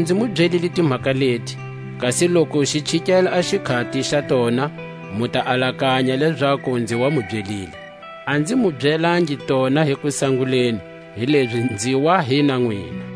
Kanilezi nzi mu byelile timhaka leti, kasi loku xi chikele a xikhati xa tona, mu ta alakanya lezaku nzi wa mu byelile. A nzi mu byelangi tona hi kusanguleni, hilezi nzi wa hi na nwina.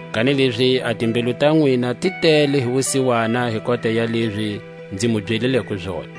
Kanilezi a timbilu ta nwina ti tele hi wusiwana hi kota ya lezi nzi mu byelileko zona.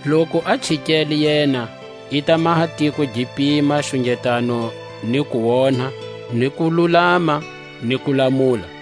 Loku a chikele yena, i ta maha tiko gi pima xungetano ni kuonha, ni kululama, ni kulamula.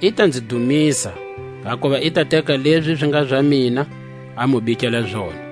I ta nzi dumisa, hakuva i ta teka lezi zi nga za mina, a mu bikela zona.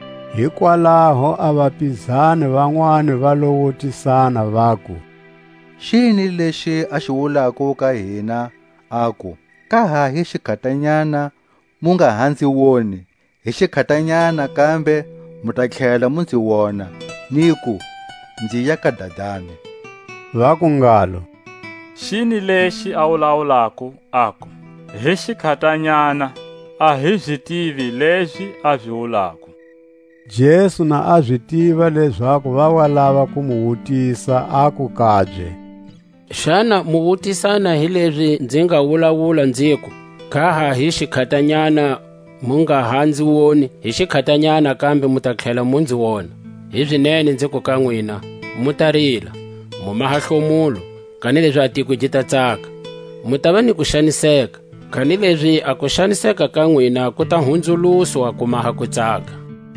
Hikwalaho a vapizani vanwani va lo wutisana, vaku: Xini lexi a xi wulako ka hina, aku; Ka ha hi xikhatanyana, mu nga ha nzi woni; hi xikhatanyana kambe mu ta tlhela mu nzi wona; niku: Nziya ka Dadani? Vaku ngalo: Xini lexi a wulawulako, aku: Hi xikhatanyana? A hi zi tivi lezi a zi wulako, Jesu na a zi tiva lezaku va wa lava ku mu wutisa, aku kabye: Xana mu wutisana hi lezi nzi nga wulawula nziku: Ka ha hi xikhatanyana, mu nga ha nzi woni; hi xikhatanyana kambe mu ta tlhela mu nzi wona? Hizinene nziku ka nwina: Mu ta rila, mu maha hlomulo, kanilezi a tiko gi ta tsaka; mu tava ni kuxaniseka, kanilezi a kuxaniseka ka nwina ku ta hunzuluswa ku maha kutsaka.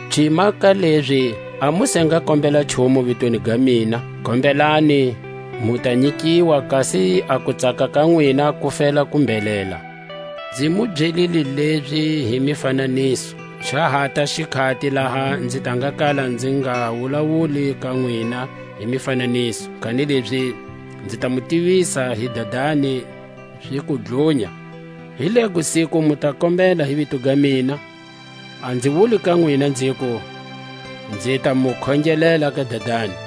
Cima ka lezi a mu se nga kombela nchumu vitweni ga mina; kombelani, mu ta nyikiwa, kasi a kutsaka ka nwina ku fela ku mbhelela. Nzi mu byelile lezi hi mifananiso; xa hata xikhati laha nzi ta nga kala nzi nga wulawuli ka nwina hi mifananiso, kanilezi nzi ta mu tivisa hi Dadani ziku dlunya. Hi lego siku mu ta kombela hi vito ga mina; a nzi wuli ka nwina nziku, nzi ta mu khongelela ka Dadani,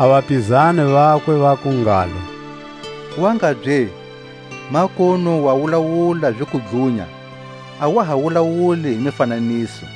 A vapizani vakwe vaku ngalo: Wangabye, makunu wa wulawula ziku dlunya, a wa ha wulawuli hi mifananiso.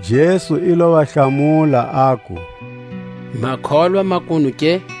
Jesu i lo va hlamula, aku: Ma kholwa makunu ke?